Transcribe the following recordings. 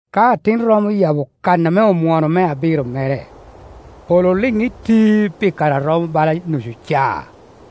Ka Atin romo oyabo kan ame omwono me abiro mere, polo oliŋ iti pi kare a romo bala nucu caa.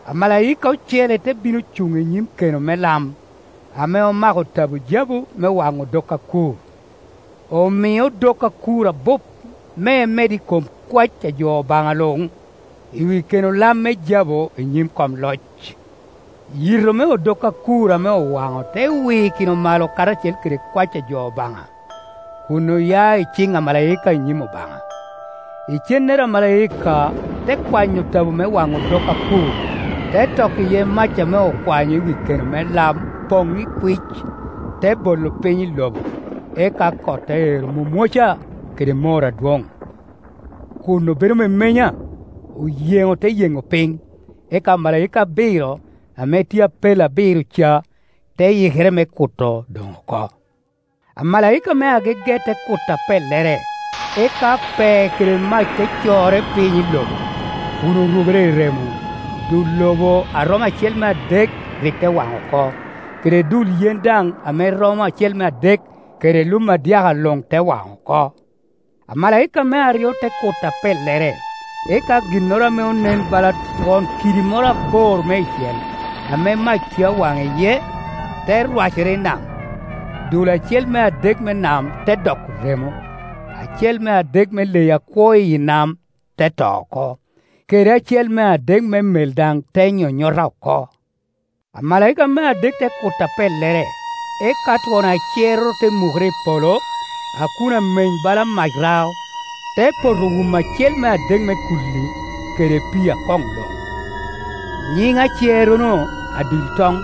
Amalaika ocele te bino cuŋ i nyim keno me lam, ame omako tabo jabu me waŋo odok akur. Omie odok akur abup me emed i kom kwae a jo Obaŋa luŋ i wi keno lam me jabu i nyim kom Ioc. Yito me odok akur ame owaŋo te wikino malo karacel kede kwac a jo Obaŋa, kun oya i ciŋ amalaika, i nyim Obaŋa. Icennere amalaika te kwanyo tabo me waŋo odok akur, te toko iye mac ame okwanyo i wi keno me lam poŋ ikwic, te bolo piny i lobo; eka kot te ero mwomwoca kede mor adwoŋ, kun obedo memenya, oyeŋo te yeŋo piny. Eka omalaika abiro, ame tye i apel abiro ca, te yikere me kuto doŋ oko. Amalaika me agege te kuto apellere, eka pee kede mac te corre piny i lobo, kun orubere i remo. Dul lobo a romo acel me adek rik te waŋ oko, kede dul yen daŋ ame romo acel me adek, kede lum adyaka luŋ te wan oko. Amalaika me aryo te kuto apellere, eka ginnoro ame onen bala twon kidi moro abor meicel, ame mac tye a waŋ iye, te rwacere i nam. Dul acel me adek me nam te doko remo, acel me adek me leyi akwo i yi nam te to oko, kede acel me adek me mel daŋ te nyonyota oko. Amalaika me adek te kuto apellere, eka twon acerroro te mukere i polo, a kun ameny bala mac rao, te poto wumo acel me adek me kulli, kede pii akoŋ luŋ. Nyiŋ acerrono, Adil toŋ.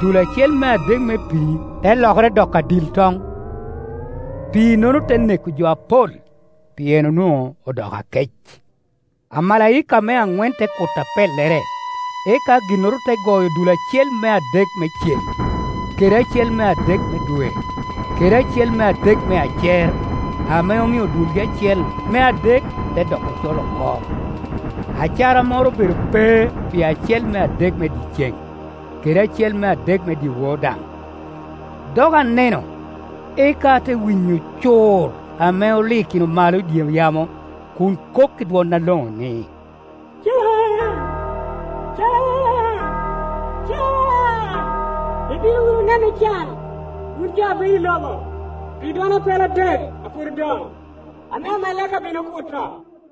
Dul acel me adek me pii te lokere doko adil toŋ, pii-nono te neko jo apol, pien onwoŋo odoko akec. Amalaika me aŋwen te kuto apellere, eka ginnoro te goyo dul acel me adek me ceŋ, kede acel me adek me dwe, kede acel me adek me acer, ame omio dulgi acel me adek te doko acol oko; acara moro obedo pe pi acel me adek me dyeceŋ, kede acel me adek me dyewor daŋ. Dok aneno, eka ate winyo cur ame olikino malo i dye yamo kun kok i dwon aloŋo ni, “Can, can, can, ibino wunu neno can, wun jo a bedo i lobo, pi dwon apel adek a pwod odoŋ, ame omalaika bino kuto!”